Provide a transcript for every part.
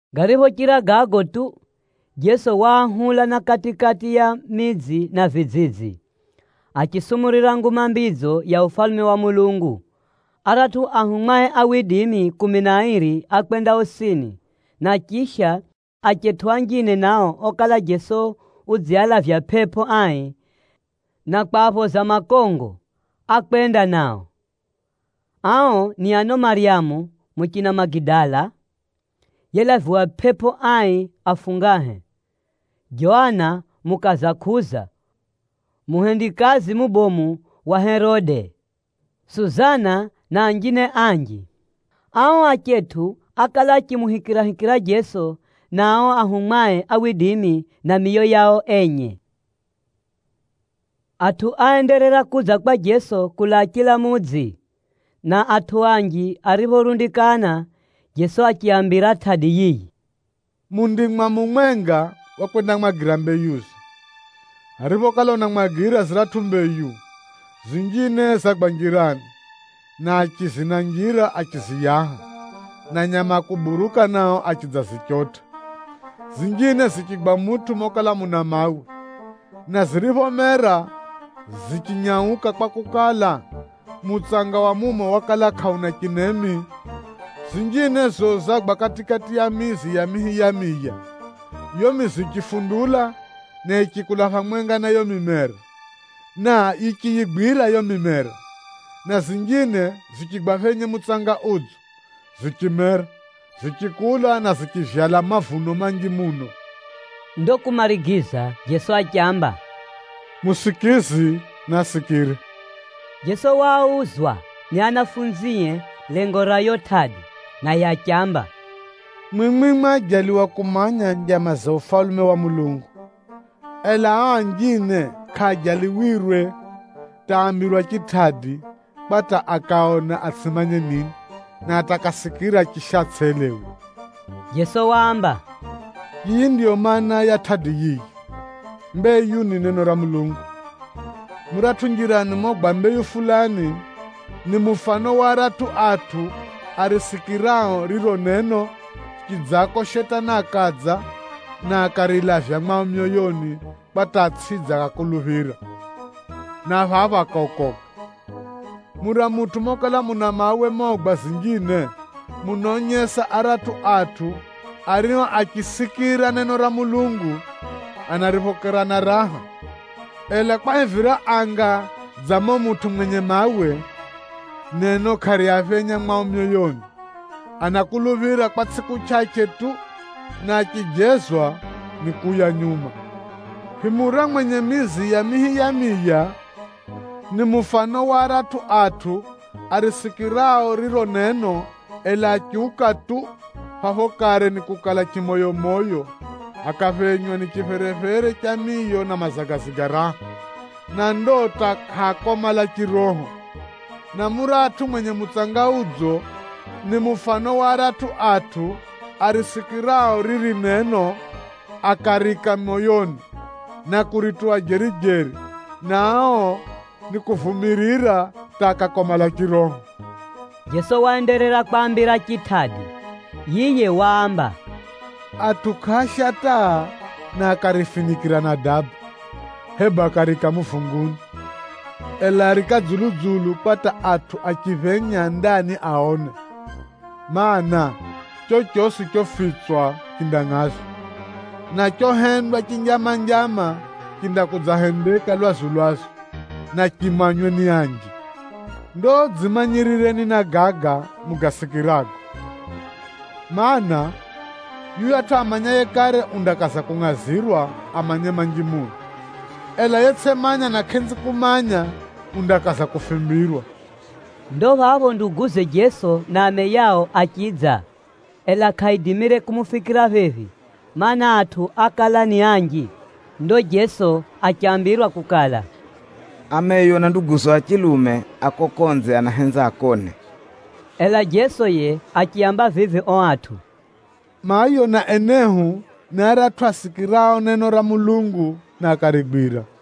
Gariphochira gago tu, Jeso waahula na kati-kati ya midzi na vidzidzi, achisumurira Nguma Mbidzo ya Ufalume wa Mulungu. Aratʼu anafunzie kumi na airi ákwenda osini, na chisha achetʼu anjine nao okala Jeso udzialavya pʼepʼo ai na kwaphoza makongo, ákwenda nao. Ao ni ano Maryamu (muchina Magidala), yelaviwa pʼepʼo ai afungahe, Joana, mukaza Kuza muhendikazi mubomu wa Herode, Suzana na anjine anji. Ao achetʼu ákala achimuhikirahikira Jeso na ao anafunzie miyo yao enye. Atʼu áenderera kudza kwa Jeso kulaa chila mudzi, na atʼu anji ariphorundikana Jeso achiaambira tʼadi yiyi: “Mundimwa mumwenga wakwendamwagira mbeyuze. Ariphokala unamwagira ziratʼu mbeyu, zinjine zagwa njirani, na achizi na njira achiziyaha, na nyama a kuburuka nao achidzazichotʼa. Zinjine zichigwa mutʼu mokala muna mawe, na ziriphomera, zichinyauka kwakukala, mutsanga wa mumo wakala kʼauna chinemi. Zinjine za zizo zagwa kati-kati ya mizi ya mihi ya miya, yiyo mizi yichifundula na yichikula phamwenga na yiyo mimera, na yichiyigwira yiyo mimera. Na zinjine zichigwa phenye mutsanga udzo, zichimera, zichikula na zichivyala mavuno manji muno.” Ndo kumarigiza Jeso achiamba, “Musikizi naasikire!” Jeso wauzwa ni anafunzie lengo ra yiyo tʼadi, naye achiamba, “Mwimwi mwajaliwa kumanya njama za Ufalume wa Mulungu, ela ao anjine kʼaajaliwirwe hata aambirwa chitʼadi, kwa hata ‘Akaona atsʼimanye nini, na hata akasikira, chisha atsʼelewe.’” Jeso waamba, “Yiyi ndiyo maana ya tʼadi yiyi: mbeyu ni neno ra Mulungu. Muratʼu njirani mogwa mbeyu fulani, ni mufano wa aratʼu atʼu arisikirao riro neno, chidzako Shetani akadza, na akarilavya mwao myoyoni kwa hata atsʼidze akakuluphira, na phapho akaokoka. Mura mutʼu mokala muna mawe mogwa zinjine, munaonyesa aratʼu atʼu ario achisikira neno ra Mulungu, anariphokera na raha. Ela kwahivira anga dza mumo mutʼu mwenye mawe, neno kʼariaphenya mwao myoyoni: anakuluphira kwa tsʼiku chʼachʼe tu, na achijezwa nikuuya nyuma. Himura mwenye mizi ya mihi ya miya, ni mufano wa aratʼu atʼu arisikirao riro neno ela achiuka tu, phapho kare nikukala chimoyomoyo, akaphenywa ni chipherephere cha miyo na mazagazi ga raha, na ndo hata kʼaakomala chiroho. Na muratʼu mwenye mutsanga udzo, ni mufano wa aratʼu atʼu arisikirao riri neno, akariika moyoni, na kurituwa jeri-jeri, na ao nikuvumirira hata akakomala chiroho.” Jeso waenderera kwaambira chitʼadi. Yiye waamba, “Atʼu kʼaasha taa na akarifinikʼira na daba, hebu akariika muvunguni. Ela, ariika dzulu-dzulu kwa hata atʼu aphenyao ndani aone. Maana, chochosi chofitswa chindafunulwa, na chohendwa chinjama-njama, chindakudzahendeka lwazu-lwazu, na chimanywe ni anji. “Ndo dzimanyirireni na gaga mugasirikisago, mana, yuyatʼu amanyaye kare undakaza kungʼazirwa amanye manji muno, ela yetsʼimanya na kʼenzi kumanya, undakaza kufimbirwa.” Ndo phapho ameye na nduguze a chilume achidza, ela kʼaaidimire kumufikira phephi, mana, atʼu ákala ni anji. Ndo Jeso achambirwa kukala, “Ameyo na nduguzo a chilume a kuko konze anahenza akone.” Ela Jeso yiye achiaamba vivi ao atʼu, “Mayo na enehu a chilume ni aratʼu asikirao neno ra Mulungu na akarigwira.”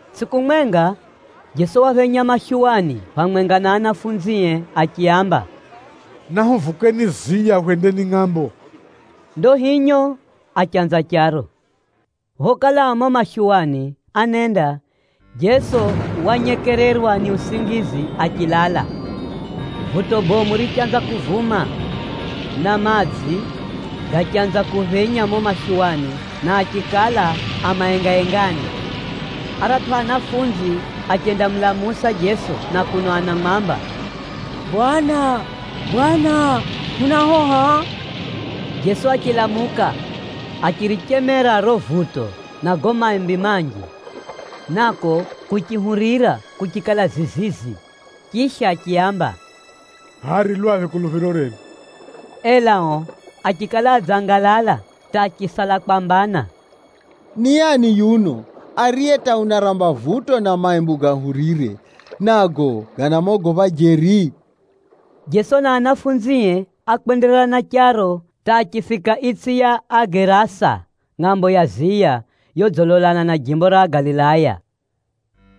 Tsʼiku mwenga, Jeso waphenya mashuwani phamwenga na anafunzie achiaamba, “Nahuvukeni ziya hwendeni ngʼambo ya phiri.” Ndo hinyo achanza charo. Phokala a mumo mashuwani anenda, Jeso wanyekererwa ni usingizi achilala. Vuto bomu richanza kuvuma, na madzi gachanza kuphenya mumo mashuwani na achikala a maengaengani. Aratʼu anafunzi achendamulamusa Jeso na kuno anamwamba, “Bwana, Bwana! Hunahoha!” Jeso achilamuka, achirichemera riro vuto na gago maimbi manji, nako kuchihurira, kuchikala zizizi. Chisha achiaamba, “Hʼaya ri lwaphi kuluphiro renu?” Ela ao achikala adzangalala hata achisala kwambana, “Ni ani yuno, ariye hata unaramba vuto na maimbi gahurire, nago ganamogopha jeri?” Jeso na anafunzie ákwenderera na charo hata achifika itsʼi ya Agerasa, ngʼambo ya ziya, yodzilolana na jimbo ra Galilaya.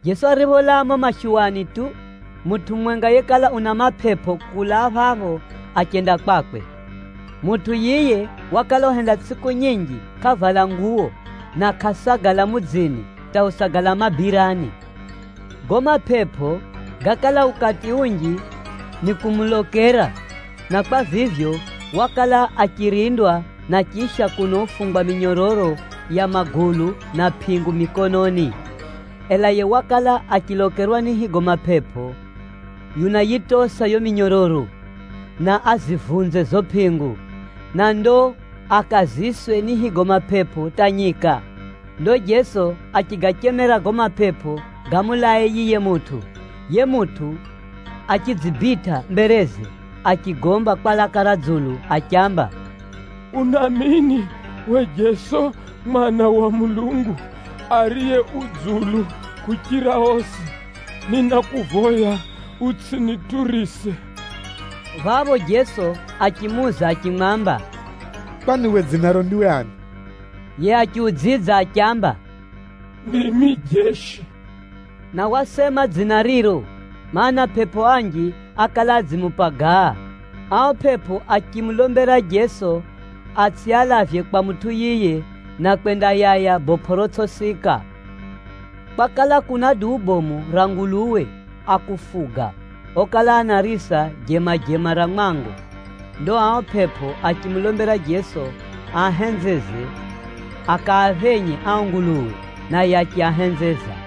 Jeso aripholaa mumo mashuwani tu, mutʼu mumwenga yekala una mapepo kulaa phapho achenda kwakwe. Mutʼu yiye wakala uhenda tsʼiku nyinji kʼavala nguwo, na kʼasagala mudzini hata usagala mabirani. Gago mapepo gákala ukati unji nikumulokera, na kwa vivyo, wakala achirindwa na chisha kuno ufungwa minyororo ya magulu na pʼingu mikononi. Ela yiye wakala achilokerwa ni higo mapepo, unayitosa yiyo minyororo, na azivunze zizo pʼingu, na ndo akaziswe ni higo mapepo hata nyika. Ndo Jeso achigachemera gago mapepo gamulae yiye mutʼu. Yiye mutʼu achidzibitʼa mbereze achigomba kwa laka ra dzulu achiamba, “Unamini uwe Jeso Mwana wa Mulungu Ariye Dzulu kuchira osi? Ninakuvoya utsʼiniturise!” Phapho Jeso achimuuza achimwamba, “Kwani we dzinaro ndiwe ani?” Yiye achiudzidza achiamba, “Ndimi Jeshi.” Na wasema dzina riro, mana, pʼepʼo anji ákala adzimupagaa. Ao pʼepʼo achimulombera Jeso atsʼialavye kwa mutʼu yiye na kwendayaya bopʼo rotsʼisika. Kwakala kuna duu bomu ra nguluwe a kufuga okala anarisa jemajema ra mwango. Ndo ao pʼepʼo achimulombera Jeso aahenzeze akaaphenye ao nguluwe, naye achiahenzeza.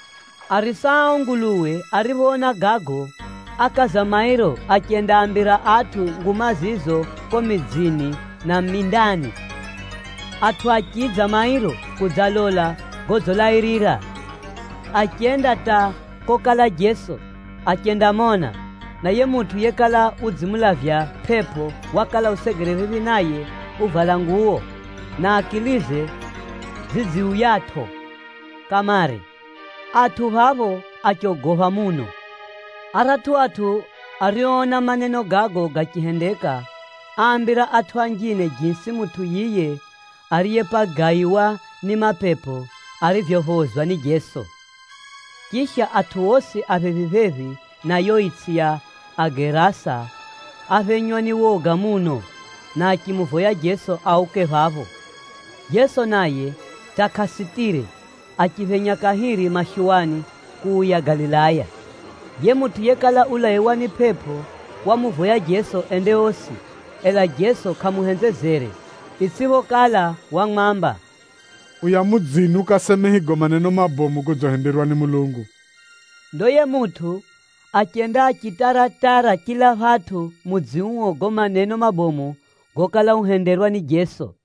Arisa a ao nguluwe ariphoona gago, ákaza mairo achendaambira atʼu nguma zizo kuko midzini na mindani. Atʼu achidza mairo kudzalola godzilairira. Achenda hata kokala Jeso, achendamona, na yiye mutʼu yekala udzimulavya pʼepʼo wakala usegere phephi naye uvala nguwo, na akilize zidziuyatʼo kamare. Atʼu phapho achogopha muno. Aratʼu atʼu arioona maneno gago gachihendeka, áambira atʼu anjine jisi mutʼu yiye ariyepagaiwa ni mapepo arivyophozwa ni Jeso. Chisha, atʼu osi a jimbo ra Agerasa áphenywa ni woga muno, na achimuvoya Jeso auke phapho. Jeso naye hata kʼasitire, achiphenya kahiri mashuwani kuuya Galilaya. Yiye mutʼu yekala ulaiwa ni pʼepʼo wamuvoya Jeso ende osi. Ela Jeso kʼamuhenzezere, itsʼiphokala wamwamba, “Uya mudzini ukaseme higo maneno mabomu godzihenderwa ni Mulungu.” Ndo yiye mutʼu achenda achitara-tara chila phatʼu mudzi uo gago maneno mabomu gokala uhenderwa ni Jeso.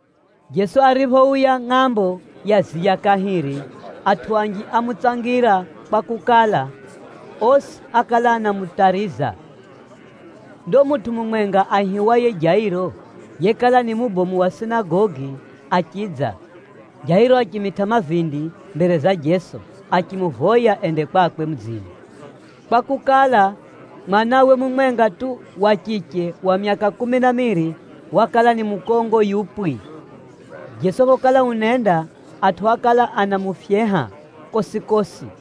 Jeso ariphouya ngʼambo ya ziya kahiri, atʼu anji ámutsangira kwakukala, osi ákala anamutariza. Ndo mutʼu mumwenga aihiwaye Jairo yekala ni mubomu wa sinagogi achidza. Jairo achimitʼa mavindi mbere za Jeso, achimuvoya ende kwakwe mudzini, kwakukala, mwanawe mumwenga tu, wa chiche wa myaka kumi na miiri, wakala ni mukongo yupwi. Jeso phokala unenda, atʼu ákala anamufyeha kosi-kosi.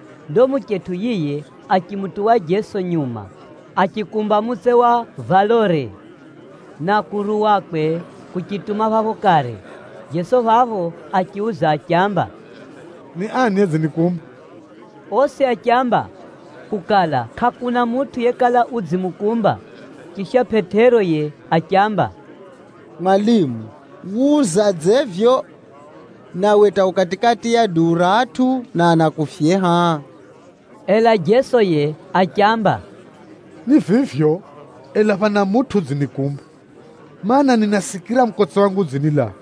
Ndo muchetʼu yiye achimutuwa Jeso nyuma, achikumba mutse wa valore, na kuruwakwe kuchituma phapho kare. Jeso phapho achiuza achiamba, “Ni ani yedzinikumba?” Osi achiamba kukala kʼakuna mutʼu yekala udzimukumba, chisha Pʼetero yiye achiamba, “Mwalimu, wuzadze vivyo nawe hata u kati-kati ya duu ra atʼu na anakufyeha?” Ela Jeso yiye achiamba, “Ni vivyo, ela phana mutʼu udzinikumba, mana, ninasikira mukotse wangu udzinilaa.”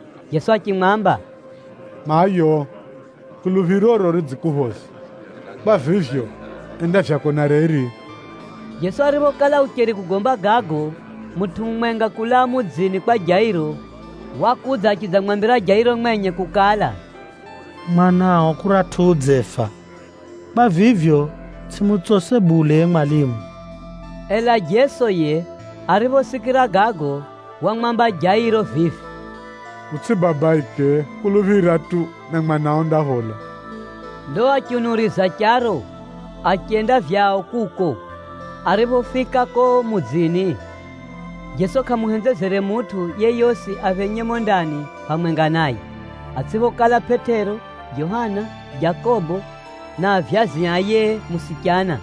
Jeso achimwamba, “Mayo, kuluphiroro ridzikuphoza, kwa vivyo, enda vyako na reri.” Jeso ariphokala ucheri kugomba gago, mutʼu mumwenga kulaa mudzini kwa Jairo, yiye mubomu wa sinagogi wakudza achidzamwambira Jairo mwenye kukala, “Mwanao kuratʼu udzefa, kwa vivyo, tsʼimutsose bule yiye mwalimu!” Ela Jeso yiye ariphosikira gago wamwamba Jairo vivi, “Utsʼibabaike, kuluphira tu, na mwanao undaphola.” Ndo achiunuriza charo achenda vyao kuko. Ariphofika kuko mudzini, Jeso kʼamuhenzezere mutʼu yeyosi aphenye mumo ndani phamwenga naye, atsʼiphokala Pʼetero, Johana, Jakobo na avyazi a yiye musichana.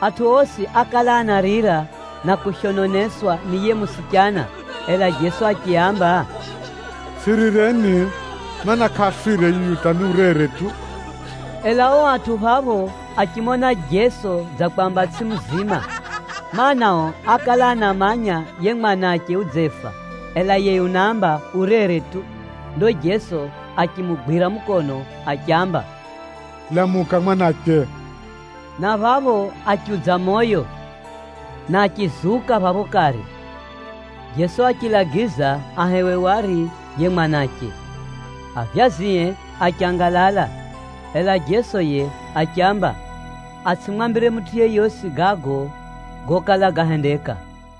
Atʼu osi ákala anarira na kushononeswa ni yiye musichana. Ela Jeso achiaamba, “Tsʼirireni, mana, kʼafire yuyu hata ni urere tu!” Ela ao atʼu phapho achimona Jeso dza kwamba tsʼiye muzima, mana, ao ákala anamanya yiye mwanache udzefa, ela yiye unaamba urere tu. Ndo Jeso achimugwira mukono achiamba, “Lamuka mwanache!” Na phapho achiudza moyo, na achizuka phapho kare. Jeso achilagiza ahewe wari yiye mwanache. Avyazie achangalala, ela Jeso yiye achiaamba atsʼimwambire mutʼu yeyosi gago gokala gahendeka.